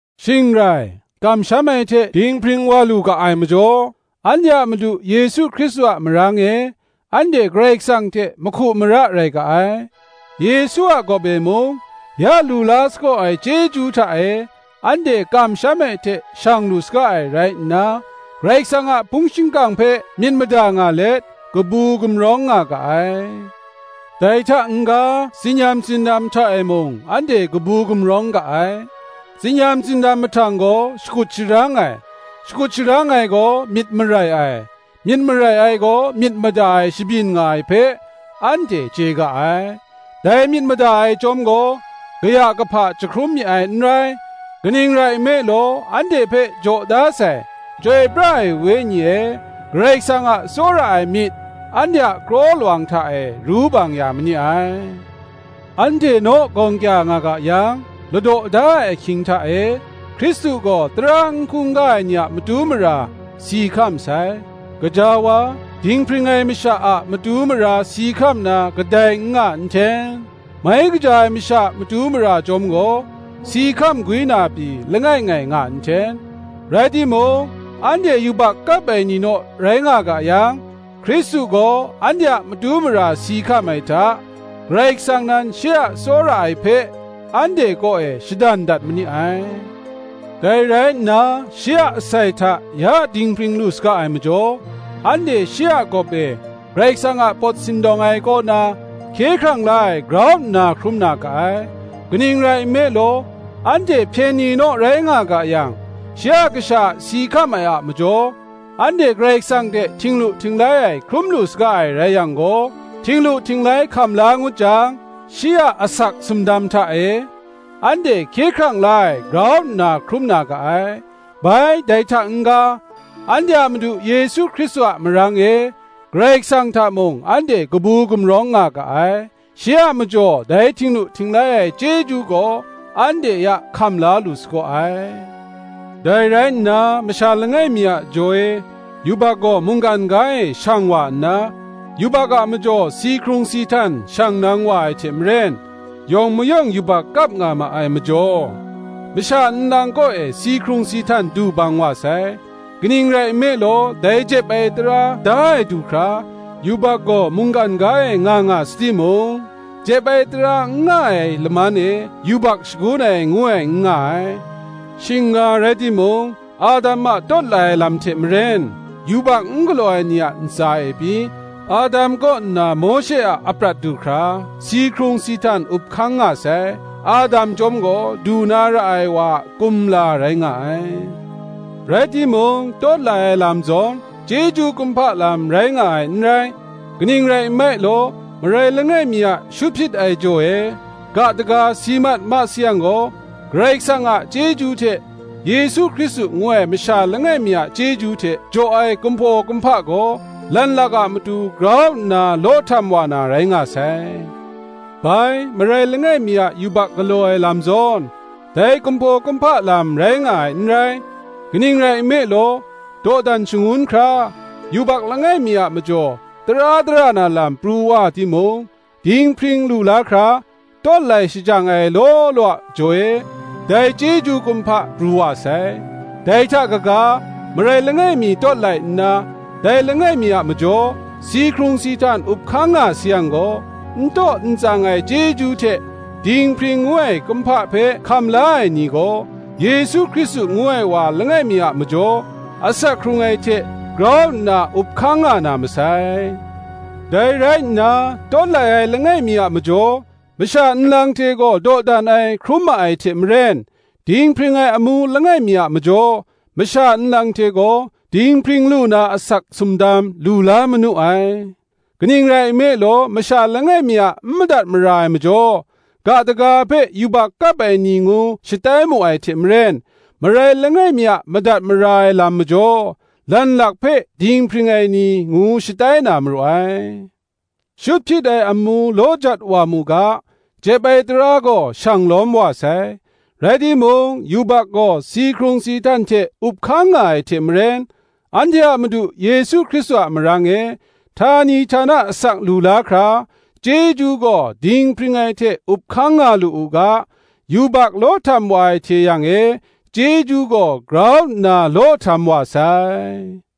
Shing rai, kamsham ai hte dinghpring wa lu ga ai majaw, anhte a Madu Yesu Hkristu a marang e, anhte Karai Kasang hte mahku mara rai ga ai: Yesu a gawp e mung, ya lu la sagaw ai chyeju hta e, anhte kamsham ai hte shang lu saga ai rai nna, Karai Kasang a hpung shingkang hpe myit mada nga let, kabu gumrawng nga ga ai. Dai hta n-ga, tsin-yam tsindam hta e mung anhte kabu gumrawng ga ai; tsin-yam tsindam mahtang gaw shakut sharang ai, shakut sharang ai gaw myit marai ai, myit marai ai gaw myit mada ai shabyin nga ai hpe, anhte chye ga ai: dai myit mada ai chyawm gaw, kaya kahpa jahkrum mi ai n rai: kaning rai nme law anhte hpe jaw da sai Chyoi pra ai Wenyi e Karai Kasang a tsawra ai myit, anhte a kraw lawang hta e ru bang ya ma ni ai. Anhte naw, gawng kya nga ga yang, ladaw da ai ahkying hta e, Hkristu gaw tara n hkungga ai ni a matu mara si hkam sai. Gaja wa, dinghpring ai masha a matu mara si hkam na kadai n nga nhten; mai kaja ai masha matu mara chyawm gaw, si hkam gwi na pyi, langai ngai nga nhten. Rai timung, anhte yubak kap ai ni naw rai nga ga yang, Hkristu gaw anhte a matu mara si hkam ai hta, Karai Kasang nan shi a tsawra ai hpe, anhte kaw e shadan dat ma ni ai. Dai rai nna, shi a asai hta ya dinghpring lu saga ai majaw, anhte shi a gawp e Karai Kasang a pawt sindawng ai kaw na, hkye hkrang la ai grau nna hkrum na ga ai. Kaning rai nme law, anhte hpyen ni naw rai nga ga yang, shi a Kasha a si hkam ai a majaw, anhte Karai Kasang hte htinglu htinglai ai hkrum lu saga ai rai yang gaw, htinglu htinglai hkam la ngut jang, shi a asak sumdam hta e, anhte hkye hkrang la ai grau nna hkrum na ga ai. Bai, dai hta n-ga, anhte a Madu Yesu Hkristu a marang e, Karai Kasang hta mung anhte kabu gumrawng nga ga ai: shi a majaw dai htinglu htinglai ai chyeju gaw anhte ya hkam la lu sagaw ai. Dai rai nna, masha langai mi a jaw e yubak gaw mungkan ga e shang wa nna, yubak a majaw si hkrung si htan shang nang wa ai hte maren, yawng mayawng yubak kap nga ma ai majaw, masha nlang kaw e si hkrung si htan du bang wa sai. Kaning rai nme law, dai jep ai tara da ai du hkra yubak gaw mungkan ga e nga nga sa timung, jep ai tara n nga ai laman e, yubak shagun ai, ngu ai, n nga ai. Shing nga rai timung, Adam a tawt lai ai lam hte maren yubak n galaw ai ni a ntsa e pyi, Adam kaw nna Mawshe a aprat du hkra si hkrung si htan up hkang nga sai: Adam chyawm gaw, du na ra ai wa a kumla rai nga ai. Rai timung, tawt lai ai lam zawn, chyeju kumhpa lam rai nga ai n rai; kaning rai nme law, marai langai mi a shut hpyit ai jaw e ga daga si mat ma sayang gaw, Karai Kasang a chyeju hte, Yesu Hkristu ngu ai masha langai mi a chyeju hte jaw ai kumhpaw kumhpa gaw, lanlak a matu grau nna law htam wa na rai nga sai. Bai, marai langai mi a yubak galaw ai lam zawn, dai kumhpaw kumhpa lam rai nga ai n rai; kaning rai nme law, dawdan shangun hkra, yubak langai mi a majaw tara dara na lam pru wa timung, dinghpring lu la hkra, tawt lai shajang ai law law a jaw e, dai chyeju kumhpa pru wa sai. Dai hta kaga, marai langai mi tawt lai nna, dai langai mi a majaw si hkrung si htan up hkang nga sayang gaw, n taw n tsang ai chyeju hte dinghpring ngu ai kumhpa hpe hkam la ai ni gaw, Yesu Hkristu ngu ai wa langai mi a majaw, asak hkrung ai hte grau nna up hkang nga na masai. Dai rai nna, tawt lai ai langai mi a majaw, masha nlang hte gaw dawdan ai hkrum ma ai hte maren, dinghpring ai amu langai mi a majaw, masha nlang hte gaw dinghpring lu na asak sumdam lu la manu ai. Kaning rai nme law, masha langai mi a n madat mara ai a majaw, ga daga hpe yubak kap ai ni ngu shatai mu ai hte maren, marai langai mi a madat mara ai lam majaw, lanlak hpe dinghpring ai ni ngu shatai na maru ai. Shut hpyit ai amu law jat wa mu ga, jep ai tara gaw shang lawm wa sai: rai timung, yubak gaw si hkrung si htan hte up hkang nga ai hte maren, anhte a Madu Yesu Hkristu a marang e, htani htana asak lu la hkra, chyeju gaw dinghpring ai hte up hkang nga lu u ga, yubak law htam wa ai hte yang e, chyeju gaw grau nna law htam wa sai.